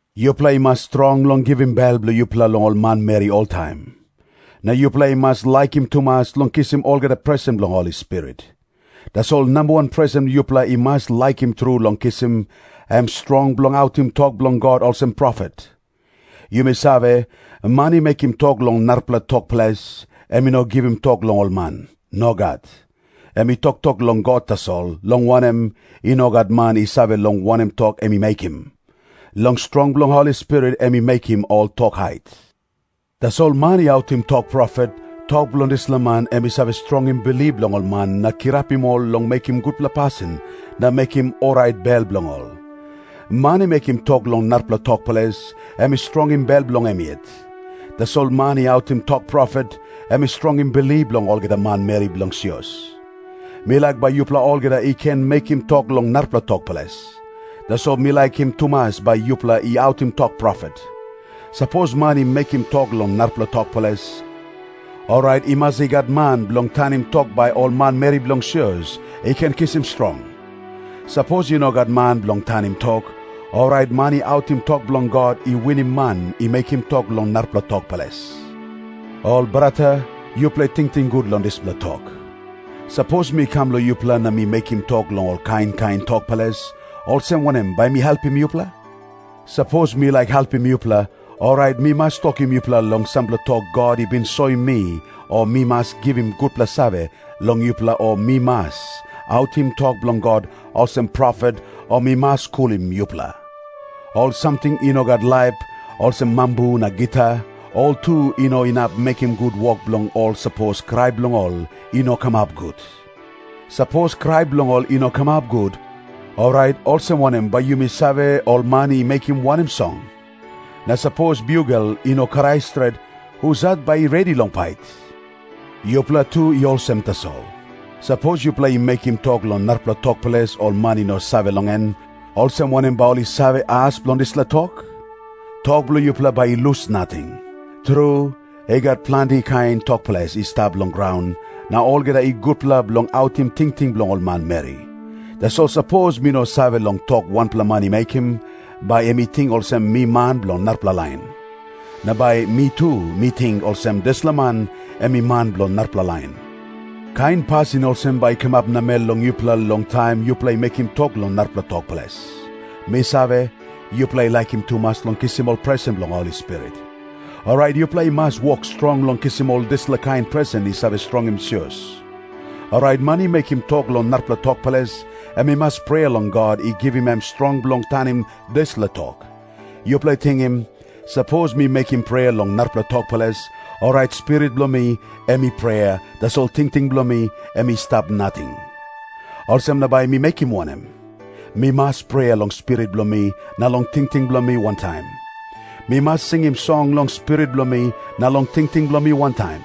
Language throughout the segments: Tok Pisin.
Yupela i mas strong long givim bel bilong yupela long ol manmeri oltaim. Na yupela i mas laikim tumas long kisim olgeta presen bilong Holi Spirit. Tasol namba wan presen yupela i mas laikim tru long kisim, em strong bilong autim tok bilong God olsem profet. Yumi save, man i mekim tok long narapela tok ples, em i no givim tok long ol man. Nogat. Em i toktok long God tasol, long wanem, i no gat man i save long wanem tok em i mekim. Long strong bilong Holi Spirit em i mekim ol tok hait. Tasol man i autim tok profet, tok bilong dispela man em i save strongim bilip bilong ol man na kirapim ol long mekim gutpela pasin na mekim orait bel bilong ol. Man i mekim tok long narapela tok ples, em i strongim bel bilong em yet. Tasol man i autim tok profet, em i strongim bilip bilong olgeta manmeri bilong sios. Mi laik bai yupela olgeta i ken mekim tok long narapela tok ples. Tasol mi laikim tumas bai yupela i autim tok profet. Sapos man i mekim tok long narapela tok ples, orait i mas i gat man bilong tanim tok bai ol manmeri bilong sios i ken kisim strong. Sapos i no gat man bilong tanim tok, orait man i autim tok bilong God i winim man i mekim tok long narapela tok ples. Ol brata, yupela tingting gut long dispela tok. Sapos mi kam long yupela na mi mekim tok long ol kain kain tok ples, olsem wanem bai mi helpim yupela? Sapos mi laik helpim yupela, orait mi mas tokim yupela long sampela tok God i bin soim mi o mi mas givim gutpela save long yupela o mi mas autim tok bilong God olsem profet o mi mas skulim yupela. Ol samting i no gat laip, olsem mambu na gita, ol tu i no inap mekim gut wok bilong ol sapos krai bilong ol i no kamap gut. Sapos krai bilong ol i no kamap gut, orait olsem wanem bai yumi save ol man i mekim wanem song? Na sapos biugel i no krai stret, husat bai i redi long pait? Yupela tu i olsem tasol. Sapos yupela i mekim tok long narapela tok ples ol man i no save long en, olsem wanem bai ol i save as bilong dispela tok? Tok bilong yupela bai i lus nating. Tru, i gat planti kain tok ples i stap long graun, na olgeta i gutpela bilong autim tingting bilong ol manmeri. Tasol sapos mi no save long tok wanpela man i mekim, bai em i ting olsem mi man bilong narapela lain. Na bai mi tu mi ting olsem dispela man em i man bilong narapela lain. Kain pasin olsem bai i kamap namel long yupela long taim yupela i mekim tok long narapela tok ples. Mi save, yupela i laikim tumas long kisim ol presen bilong Holi Spirit. Orait yupela i mas wok strong long kisim ol dispela kain presen i save strongim sios. Orait man i mekim tok long narapela tok ples, em i mas prea long God i givim em strong bilong tanim dispela tok. Yupela tingim. Sapos mi mekim prea long narapela tok ples, orait spirit bilong mi em i prea, tasol tingting bilong mi em i stap nating. Olsem na bai mi mekim wanem? Mi mas prea long spirit bilong mi na long tingting bilong mi wantaim. Mi mas singim song long spirit bilong mi na long tingting bilong mi wantaim.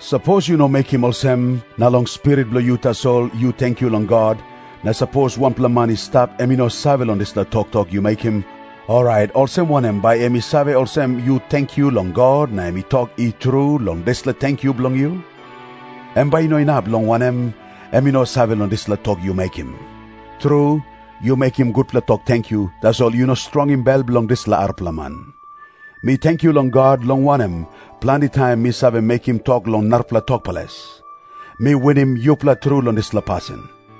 Sapos yu no mekim olsem, na long spirit bilong yu tasol yu tenkyu long God, na sapos wanpela man i stap em i no save long dispela toktok yu mekim, orait olsem wanem bai em i save olsem yu tenkyu long God, na em i tok “I tru” long dispela tenkyu bilong yu? Em bai i no inap, long wanem, em i no save long dispela tok yu mekim. Tru, yu mekim gutpela tok tenkyu, tasol yu no strongim bel bilong dispela arapela man. Mi tenkyu long God, long wanem, planti taim mi save mekim tok long narapela tok ples. Mi winim yupela tru long dispela pasin.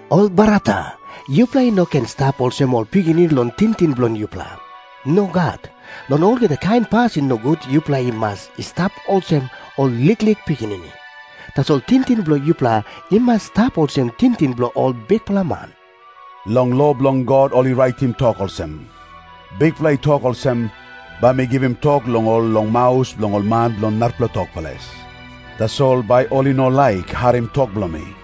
Ol brata, yupela i no ken i stap olsem ol pikinini long tingting bilong yupela. Nogat. Long olgeta kain pasin nogut yupela i mas i stap olsem ol liklik pikinini. Tasol tingting bilong yupela i mas i stap olsem tingting bilong ol bikpela man. Long lo bilong God ol i raitim tok olsem, “Bikpela i tok olsem, ‘Bai mi givim tok long ol long maus bilong ol man bilong narapela tok ples. Tasol bai ol i no laik harim tok bilong mi.’”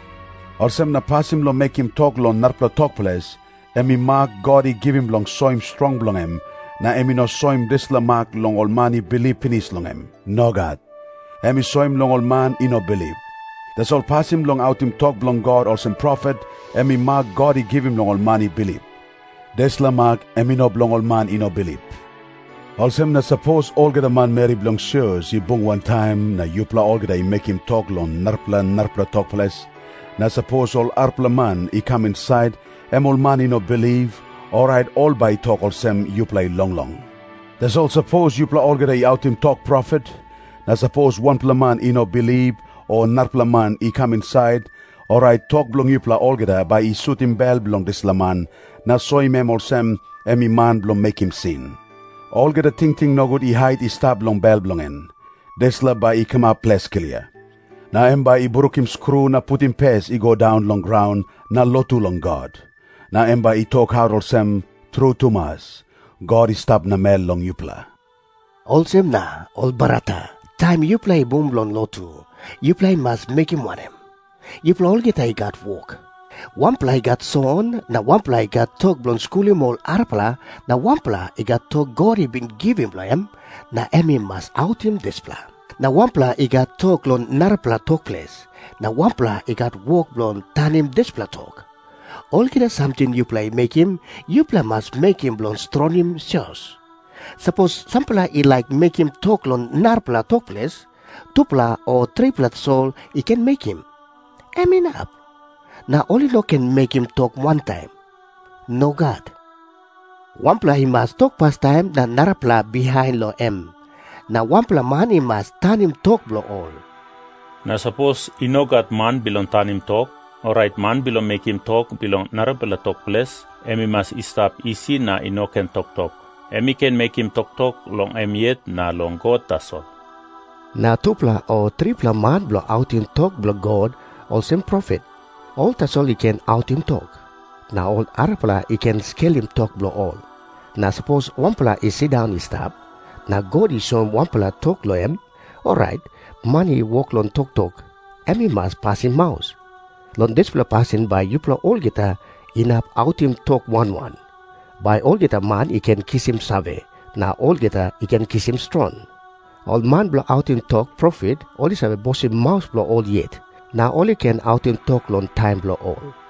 Olsem na pasin bilong mekim tok long narapela tok ples, em i mak God i givim bilong soim strong bilong em, na em i no soim dispela mak long ol man i bilip pinis long em. Nogat. Em i soim long ol man i no bilip. Tasol pasin bilong autim tok bilong God olsem profet, em i mak God i givim long ol man i bilip. Dispela mak em i no bilong ol man i no bilip. Olsem na sapos olgeta manmeri bilong sios i bung wantaim, na yupela olgeta i mekim tok long narapela narapela tok ples, na sapos ol arapela man i kam insait, em ol man i no bilip, orait ol bai i tok olsem yupela i longlong. Tasol sapos yupela olgeta i autim tok profet, na sapos wanpela man i no bilip o narapela man i kam insait, orait tok bilong yupela olgeta bai i sutim bel bilong dispela man, na soim em olsem em i man bilong mekim sin. Olgeta tingting nogut i hait i stap long bel bilong en, dispela bai i kamap ples klia. Na em bai i brukim skru na putim pes i go daun long graun, na lotu long God. Na em bai i tokaut olsem, “Tru tumas, God i stap namel long yupela.” Olsem na, ol brata, taim yupela i bung bilong lotu, yupela i mas mekim wanem? Yupela olgeta i gat wok. Wanpela i gat song na wanpela i gat tok bilong skulim ol arapela na wanpela i gat tok God i bin givim long em, na em i mas autim dispela. Na wanpela i gat tok long narapela tok ples, na wanpela i gat wok b ilong tanim dispela tok. Olgeta samting yupela i mekim, yupela i mas mekim bilong strongim sios. Sapos sampela i laik mekim tok long narapela tok ples, tupela o tripela tasol i ken mekim. Em inap. Na ol i no ken mekim tok wantaim. Nogat. Wanpela i mas tok pastaim na narapela bihain long em. Na wanpela man i mas tanim tok bilong ol. Na sapos i no gat man bilong tanim tok, orait man bilong mekim tok long narapela tok ples, em i mas i stap isi na i no ken toktok. Em i ken mekim toktok long em yet na long God tasol. Na tupela o tripela man bilong autim tok bilong God olsem profet, ol tasol i ken autim tok. Na ol arapela i ken skelim tok bilong ol. Na sapos wanpela i sindaun i stap, na God i soim wanpela tok long em, orait man i wok long toktok, em i mas pasim maus. Long dispela pasin bai yupela olgeta inap autim tok wan wan, bai olgeta man i ken kisim save, na olgeta i ken kisim strong. Ol man bilong autim tok profet, ol i save bosim maus bilong ol yet, na ol i ken autim tok long taim bilong ol.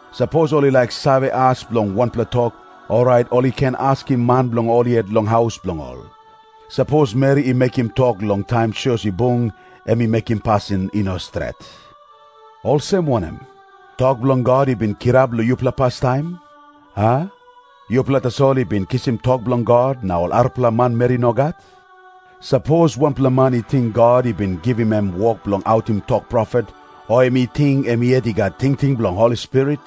Sapos ol i laik save as bilong wanpela tok, orait ol i ken askim man bilong ol yet long haus bilong ol. Sapos meri i mekim tok long taim sios i bung, em i mekim pasin i no stret. Olsem wanem? Tok bilong God i bin kirap long yupela pastaim, a? Yupela tasol i bin kisim tok bilong God, na ol arapela manmeri nogat? Sapos wanpela man i ting God i bin givim em wok bilong autim tok profet, o em i ting em yet i gat tingting bilong Holi Spirit,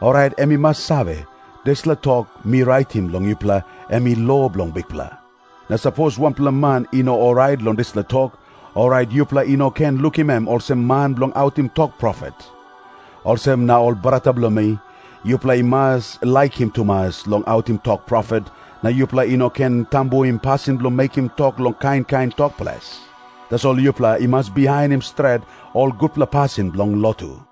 orait em i mas save, dispela tok mi raitim long yupela em i lo bilong Bikpela. Na sapos wanpela man i no orait long dispela tok, orait yupela i no ken lukim em olsem man bilong autim tok profet. Olsem na, ol brata bilong mi, yupela i mas laikim tumas long autim tok profet, na yupela i no ken tambuim pasin bilong mekim tok long kain kain tok ples. Tasol yupela i mas bihainim stret ol gutpela pasin bilong lotu.